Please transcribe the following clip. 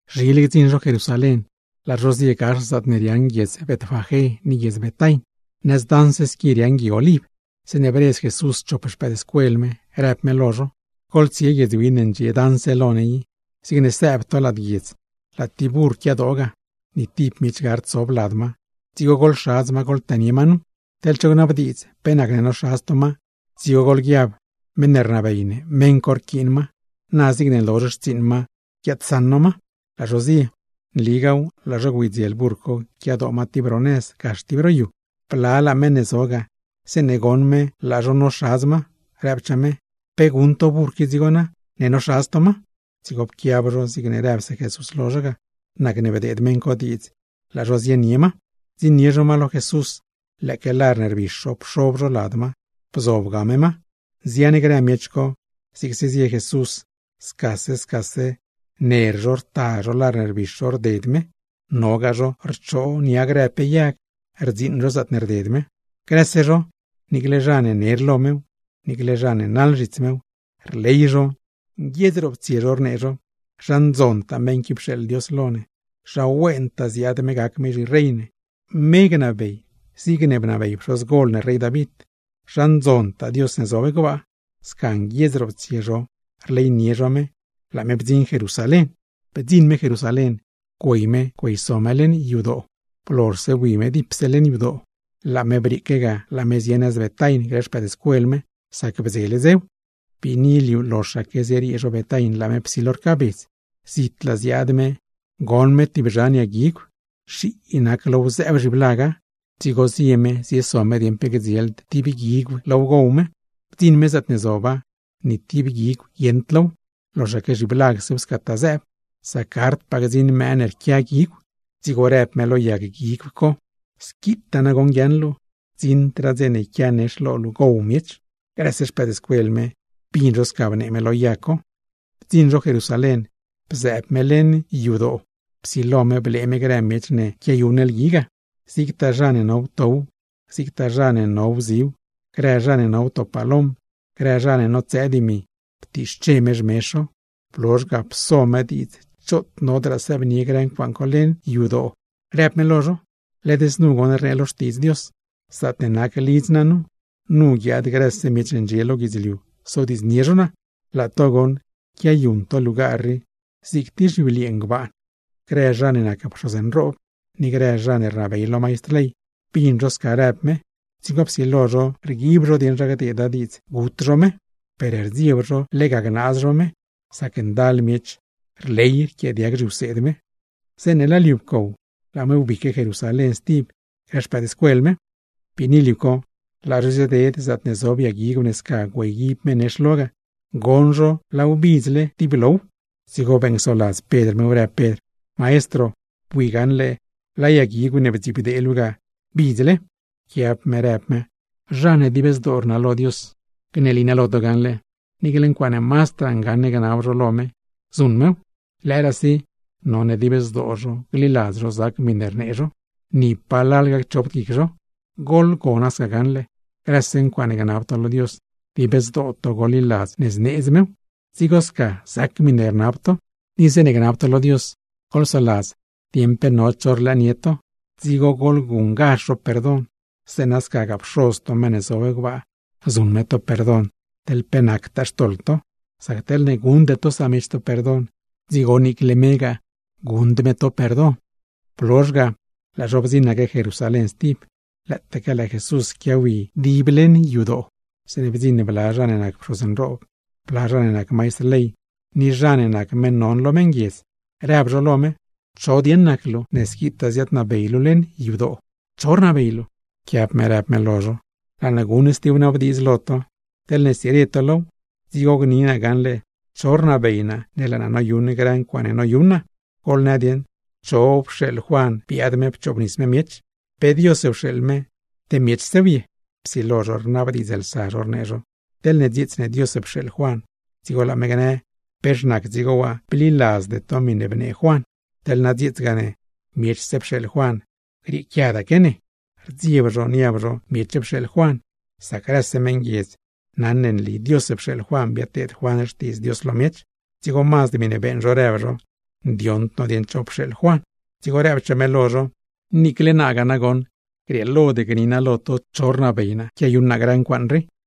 Zhile gdziṉ zho Jerusalén, laa zho zie gax zaatne riaaṉ guiedz Betfagé ni guiedz Betain, nëz daṉ squi riaaṉ Gui Oliv, zeeṉe bredz Jesús chop xpëëdscuel me rëb me lo zho: ―Goḻtsie guiedz win ne ndxie daṉse lo ne i. Zigne sëëb to lad guiedz, laa tib burr quiadoo ga, ni tib miech gard sob lad ma; dzigo goḻxadz ma, goḻtënie ma nu. Teḻ cho gnabdiidz pe nacne noxadz to ma, dzigo goḻguiab: meṉ ne rnabey ne meṉ co rquiin ma, na zigne lozh xtsiiṉ ma guiaadsaṉ no ma. Laa zho zie, nligaaw laa zho güeydziel burr co quiadoo ma tib ro nëz, gax tib ro yu. Blalaa zha ne zo ga, zeeṉe goṉ zho laa zho noxadz ma, rëbchaa zho: ―¿Pe guṉ to burr qui dzigo na, ne noxadz to ma? Dzigo pquiab zho zigne rëbse Jesús lo zho ga, nacne bdeed meṉ co diidz laa zho zienie ma. Bdziṉnie zho ma lo Jesús lëëque lar ne rbix zho pxob zho lad ma, bzobga me ma. Nzian grë miech co zigse zie Jesús, scase scase ner zho rta zho lar ne rbix zho rded me, nogaa zho rchoo nia grë pe yag rdziiṉ zho zaatne rded me. Grëse zho, niicle zha ne ner lo mew, niicle zha ne naḻ zhits mew, rley zho nguiedz roptsie zho, rnee zho: ―¡Zha ndzontaa meṉ qui pxeeḻ Dios lo ne! ¡Zha wentaa ziaad me gac me zhirey ne! ¡Me gnabey zigne bnabey pxozgol ne rey David! ¡Zha ndzontaa Dios ne zob gbaa! Sca nguiedz roptsie zho rleynie zho me, laa me bdziṉ Jerusalén. Bdziṉ me Jerusalén, güey me güeyso me leṉ yadoo. Blozhse bui me dipse leṉ yadoo, laa me brieeque ga laa me zie nëz Betain grë xpëëdscuel me, sac bdzele dzew. Biini liu, loxaque zieriee zho Betain laa me psilo rcaabedz. Zitlaa ziaad me goṉ me tib zhan yag guigw, nxii nac low zëëb zhiblaga; dzigo zie me zieso me dieṉ pe gdzield tib guigw low gow me. Bdziṉ me zaatne zoba, ni tib guigw guieṉd low loxaque zhiblagsew scataa zëëb, sac gardpaa gdziṉ mëë ne rquia guigw. Dzigo rëb me lo yag guigw co: ―¡Squitaa nagoṉ guiaaṉ luu! ¡Gdziṉdraa dze yquia nex lo luu gow miech! Grëse xpëëdscuel me, bin zho sca bnee me lo yag co. Bdziṉ zho Jerusalén, bzëëb me leṉ yadoo. Psilo me blee me grëse miech ne quiayuṉ lgui ga, zigtaa zha ne no wtow, zigtaa zha ne no wziw. Grë zha ne no wto palom, grë zha ne notsëë dimi, ptiixche me xmezh zho. Blozh ga, pso me diidz choot nodraa sëëbnie grë ncuaaṉ co leṉ yadoo, rëb me lo zho: ―Led znu goṉ rnee lo Xtiidz Dios: “Zaatne nac lidz naa nu, nu guiaad grëse miech ne ndxie lo guidzliu sodiidznie zho naa.” Laa to goṉ quiayuṉ to lugar rii zig tib zhibliee ngbaan. Grë zha ne nac pxoz nroob ni grë zha ne rnabey lo maistr ley, bin zho sca rëb me, dzigo psilo zho rguib zho dieṉ zha gdeeda diidz gut zho me. Per rdzieb zho lega gnaaz zho me, sac ndal miech ne rley rquiaadiag zhiwseed me. Zeeṉe laa liu pcow, laa me wbique Jerusalén stib grë xpëëdscuel me. Biini liu co, laa zho zieded zaatne zob yag guigw ne sca güeyguib me nex lo ga, goṉ zho laaw bidzle dib low. Dzigo beeṉcsoladz Pedr mew, rëb Pedr: ―Maestro, bui gaṉle laa yag guigw ne bdzibdee luu ga bidzle. Pquiab me rëb me: ―Zha ne dib zdoo rnalo Dios, gneli naa lo to gaṉle: Niicle ncuaaṉe mazdraa ngaṉ gnab zho lo me, zuṉ mew; lëëraasi none dib zdoo zho gliladz zho zac miṉe rnee zho, ni palal gacchopd guic zho. Goḻgona sca gaṉle, grëse ncuaaṉe gnab to lo Dios, dib zdoo to goḻliladz ne zneedz mew, dzigo sca zac miṉe rnab to. Ni zeeṉe gnab to lo Dios, goḻsoladz dieṉ pe no cho rlëënie to, dzigo goḻguṉ zho perdon; zeeṉa scagaa, Pxoz to meṉ ne zob gbaa zuṉ me to perdon teḻ pe nactaa xtoḻ to. Sac teḻne guṉde to samiech to perdon, dzigo niicle megaa, guṉd me to perdon. Blozh ga, laa zho bdziṉaque Jerusalén stib. Lëëtaaque laa Jesús quiawi dib leṉ yadoo, zeeṉe bdziṉ bla zha ne nac pxoz nroob, bla zha ne nac maistr ley ni zha ne nac meṉ non lo meṉguiedz, rëb zho lo me: ―¿Cho dieṉ nac luu ne squitaa ziaadnabey luu leṉ yadoo? ¿Cho rnabey luu? Pquiab me rëb me lo zho: ―Laa naa guṉ tib wnabdiidz lo to. Teḻne stsire to low, dzigo gni naa lo to gaṉle cho rnabey naa ne laa naa noyuṉ grë ncuaaṉe noyuṉ naa. Goḻnë dieṉ, ¿cho pxeeḻ Juan biaad me pchoobnis me miech? ¿Pe Dios pxeeḻ me, te miechsew ye? Psilo zho rnabdiidzlsa zho, rnee zho: ―Teḻne dzieets ne Dios pxeeḻ Juan, dzigo laa me gnë: “¿Pex nac dzigo waa bliladzde to miṉe bnee Juan?” Teḻ na dzieetsgaa ne: “Miechse pxeeḻ Juan, grieequiadaque ne.” Rdzieb zho niab zho miech pxeeḻ Juan, sac grëse meṉguiedz naṉ ne nli Dios pxeeḻ Juan biadteed Juan xtiidz Dios lo miech. Dzigo mazd miṉe beeṉ zho, rëb zho: ―Ndioṉd no dieṉ cho pxeeḻ Juan. Dzigo rëbchaa me lo zho: ―Niicle naagaa nagoṉ, grieelod gni naa lo to cho rnabey naa quiayuṉ naa grë ncuaaṉ rii.